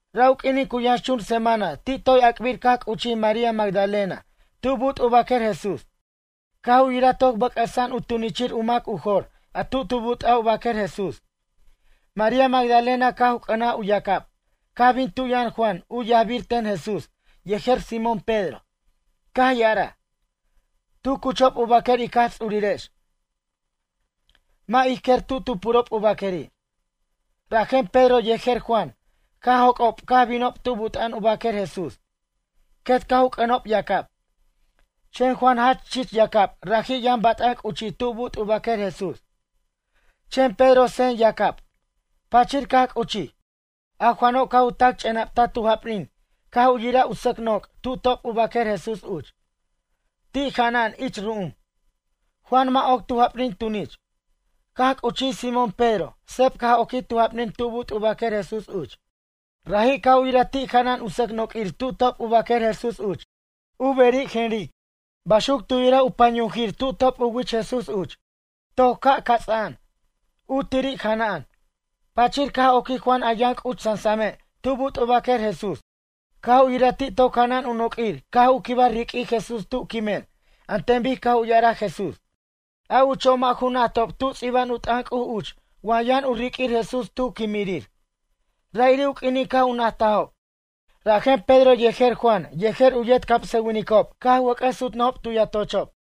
Ra' u q'uinin cu yʌnxchun semana ti' toy ac'bir caj c'uchij María Magdalena tu' but' u baquer Jesús. Caj u yiraj toc bʌc'ʌsa'an u tunichirir u mac u jor a tu tu but'aj u baquer Jesús. María Magdalena caj u c'ʌnaj u yacab caj bin tu' yʌn Juan u yajbir ten Jesús yejer Simón Pedro. Caj ya'araj: ―Tu cuchob u baquer ic Jaj Ts'urirex, mʌ' ij quer tu tu purob u baqueri'. Rajen Pedro yejer Juan caj joc'ob caj binob tu' but'a'an u baquer Jesús. Quet caj u c'ʌnob yacab. Chen Juan jach chich yacab raji' yʌn bat'an c'uchij tu but' u baquer Jesús. Chen Pedro sen yacab, pachir caj c'uchij. A Juano' caj u tac ch'ena'btaj tu japnin caj u yiraj u sʌc noc' tu top u baquer Jesús uch. Ti' jana'an ich ru'um. Juan mʌ' oc tu japnin tunich. Caj c'uchij Simón Pedro seb caj oquij tu japnin tu but' u baquer Jesús uch. Raji' caj u yiraj ti' jana'an u sʌc noq'uir tu top u baquer Jesús uch. U beri' jenric. Baxuc tu yiraj u panyujir tu top u wich Jesús uch. Toc ca' ts'a'an, u tiri' jana'an. Pachir caj oquij Juan a yʌn c'uch sasame' tu but' u baquer Jesús. Caj u yira ti' toc jana'an u noq'uir caj u quibaj riq'uij Jesús tu' quimen an ten bic caj u ya'araj Jesús. A ucho' mʌ' ju najtob tu ts'iba'an u t'ʌn C'uj uch wa yʌn u riq'uir Jesús tu quimirir. Ra'iri' u q'uinin caj u najtajob. Rajen Pedro yejer Juan yej u yet camsʌwinicob caj wʌc'ʌs sutnʌjob tu yatochob.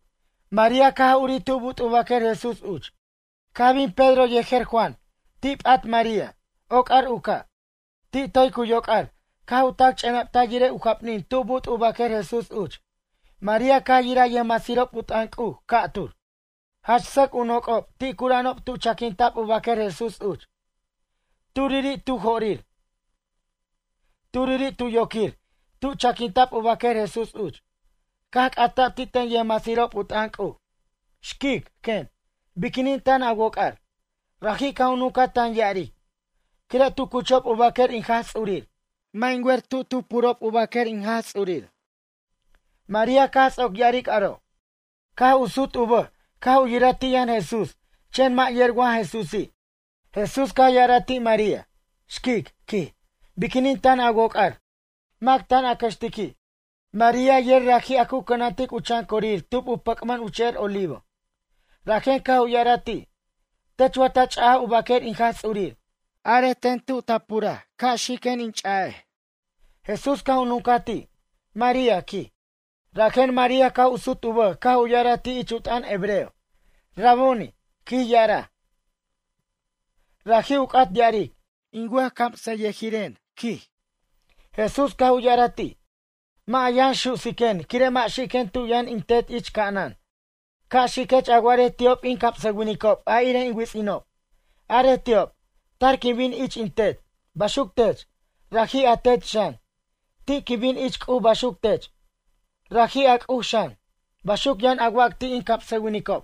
María caj ca' urij tu but' u baquer Jesús uch. Caj bin Pedro yejer Juan ti' p'at María. Oc'ar u ca'. Ti' toy cu yoc'ar caj u tac ch'enaptaj yirej u japnin tu but' u baquer Jesús uch. María caj yiraj yʌjmasirob u t'ʌn C'uj ca'tur, jach sʌc u noc'ob ti' cura'anob tu chaquinta'b u baquer Jesús uch. Turiri' tu jo'rir, turiri' tu yoquir tu chaquinta'b u baquer Jesús uch. Caj c'ata'b ti' ten yʌjmasirob u t'ʌn C'uj: ―Xquic ―quen―, biquinin tan a woc'ar? Raji' caj u nuncaj tan ya'aric: ―Quire' tu cuchob u baquer in Jaj Ts'urir, mʌ' in wer tuj tu purob u baquer in Jaj Ts'urir. María caj ts'oc ya'aric aro' caj u sut u bʌj caj u yiraj ti' yʌn Jesús chen mʌ' yer wa Jesúsi'. Jesús caj ya'araj ti' María: ―Xquic ―quij―, biquinin tan a woc'ar? Mac tan a cʌxtiqui'? María yer raji' a cu cʌnantic u chan corir tub u pʌc'mʌn u che'er Olivo. Rajen caj u ya'araj ti': ―Tech wa ta ch'ajaj u baquer in Jaj Ts'urir, arej ten tub a puraj ca' xiquen in ch'a'ej. Jesús caj u nuncaj ti': ―María ―quij. Rajen María caj u sut u bʌj caj u ya'araj ti' ich u t'ʌn hebreo: ―Raboni ―quij ya'araj. Raji' u c'at ya'aric: A wʌjcamsʌyʌjiren, quij Juan. Jesús caj u ya'araj ti': ―Mʌ' a yʌn su'siquen quire' mʌ' xiquen tu' yʌn in Tet ich ca'anan. Ca' xiquech a wa'arej ti'ob in camsʌwinicob a irej in wits'inob. Arej ti'ob: tar quin bin ich in Tet. Baxuc tech, raji' a Tet xan. Ti' quin bin ich C'uj baxuc tech, raji' a C'uj xan. Baxuc yʌn a wac ti' in camsʌwinicob.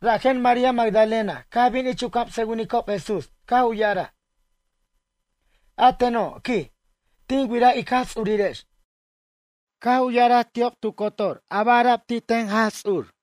Rajen María Magdalena caj bin ich u camsʌwinicob Jesús caj u ya'araj: ―A teno' ―quij―, tin wiraj ic Jaj Ts'urirex. Caj u ya'araj ti'ob tu cotor a ba' ara'b ti' ten Jaj Ts'ur.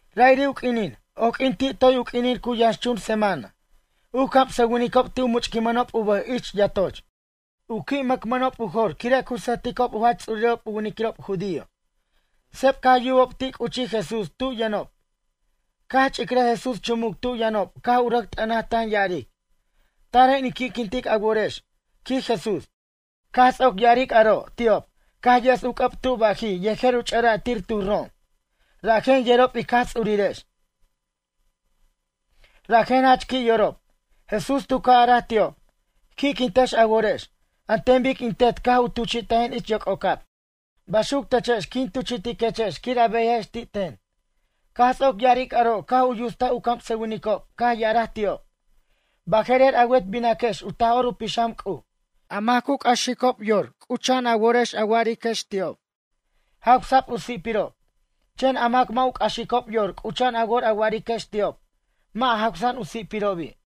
Ra'iri' u q'uinin, oq'uin ti' toy u q'uinin cu yʌnxchun semana. U camsʌwinicob ti' u much'quinmʌnob u bʌj ich yatoch. U qui' mʌcmʌnob u jor quire' cu sʌjticob u jach ts'urirob u winiquirob judío. Seb caj yubob ti' c'uchij Jesús tu' yʌnob. Caj ch'icrʌj Jesús chumuc tu' yʌnob caj u rʌc t'ʌnaj tan ya'aric: ―Taren in qui'quint a worex ―quij Jesús. Caj ts'oc ya'aric aro' ti'ob caj yes u c'ʌb tuj bajij yejer u ch'ʌ'ra'tir tuj rom. Rajen yerob ic Jaj Ts'urirex. Rajen jach qui' yorob. Jesús tu ca' araj ti'ob: ―Qui'quintex a worex. An ten bic in Tet caj u tuchi'tajen ich yoc'ocab. Baxuc techex quin tuchi'tiquechex quir a beyajex ti' ten. Caj ts'oc ya'aric aro' caj u yustaj u camsʌwinicob caj ya'araj ti'ob: ―Baje'rer a wet binaquex u Taj'or u Pixam C'uj. A mac cu c'axicob yor c'ucha'an a worex a wa'ariquex ti'ob: “Jawsa'b u si'pirob.” Chen a mac mʌ' u c'axicob yor c'ucha'an a wor a wa'ariquex ti'ob: “Mʌ' jawsa'an u si'pirobi'.”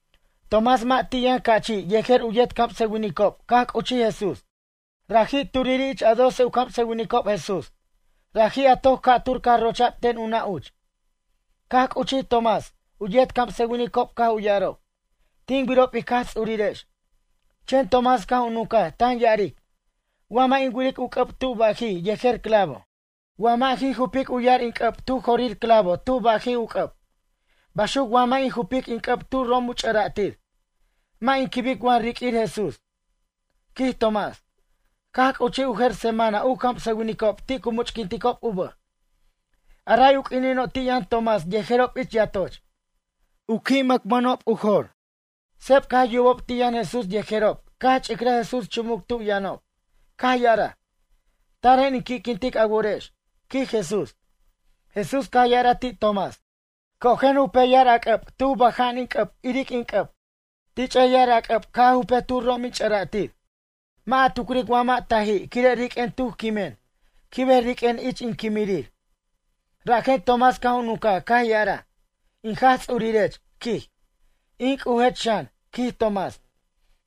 Tomás mʌ' ti' yʌn ca'chi' yejer u yet camsʌwinicob caj c'uchij Jesús. Raji' turiri' ich a doce u camsʌwinicob Jesús. Raji' a toc ca'tur caj rocha'b ten u nʌ' uch. Caj c'uchij Tomás. U yet camsʌwinicob caj u ya'arob: ―Tin wirob ic Jaj Ts'urirex. Chen Tomás caj u nuncaj tan ya'aric: ―Wa mʌ' in wiric u c'ʌb tu bajij yejer clavo. Wa mʌ' in jupic u yar in c'ʌb tu jorir clavo tuj bajij u c'ʌb, baxuc wa mʌ' in jupic in c'ʌb tuj rom u ch'ʌra'tir, mʌ' in quibic wa riq'uir Jesús ―quij Tomás. Caj c'uchij u jer semana u camsʌwinicob ti' cu much'quinticob u bʌj. A ray u q'uinino' ti' yʌn Tomás yejerob ich yatoch. Qui' mʌcmʌnob u jor. Seb caj yubob ti' yʌn Jesús yejerob caj ch'irʌj Jesús chumuc tu' yʌnob. Caj ya'araj: ―Taren in qui'quintic a worex ―quij Jesús. Jesús caj ya'araj ti' Tomás: ―Cojen jupej yar a c'ʌb tuj bʌja'an in c'ʌb iric in c'ʌb. Tich'ej yar a c'ʌb ca' a jupej tuj rom in ch'ʌra'tir. Mʌ' a tucric wa mʌ' taji' quire' riq'uen tuj quimen. Quibej riq'uen ich in quimirir. Rajen Tomás caj u nuncaj caj ya'araj: ―In Jaj Ts'urirech ―quij―, in C'ujech xan ―quij Tomás.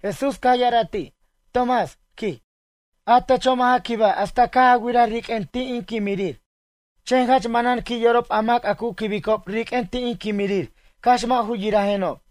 Jesús caj ya'araj ti': ―Tomás ―quij―, a techo' mʌ' ja quibaj hasta caj a wiraj riq'uen ti' in quimirir. Chen jach manan qui' yorob a mac a cu quibicob riq'uen ti' in quimirir cax mʌ' ju yirajenob.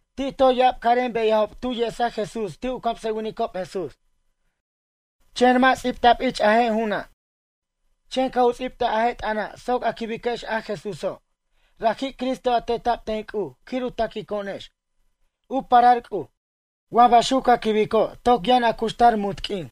Ti' toy ya'ab carem beyajob tu yesaj Jesús ti' u camsʌwinicob Jesús. Chen mʌ' ts'ibta'b ich a je' ju'una'. Chen caj u ts'ibtaj a je' t'ʌna' soc a quibiquex a Jesúso', raji' Cristo a teta'b ten C'uj quir u taquico'onex, u parar C'uj. Wa baxuc ca quibico' toc yʌn a cuxtar munt q'uin.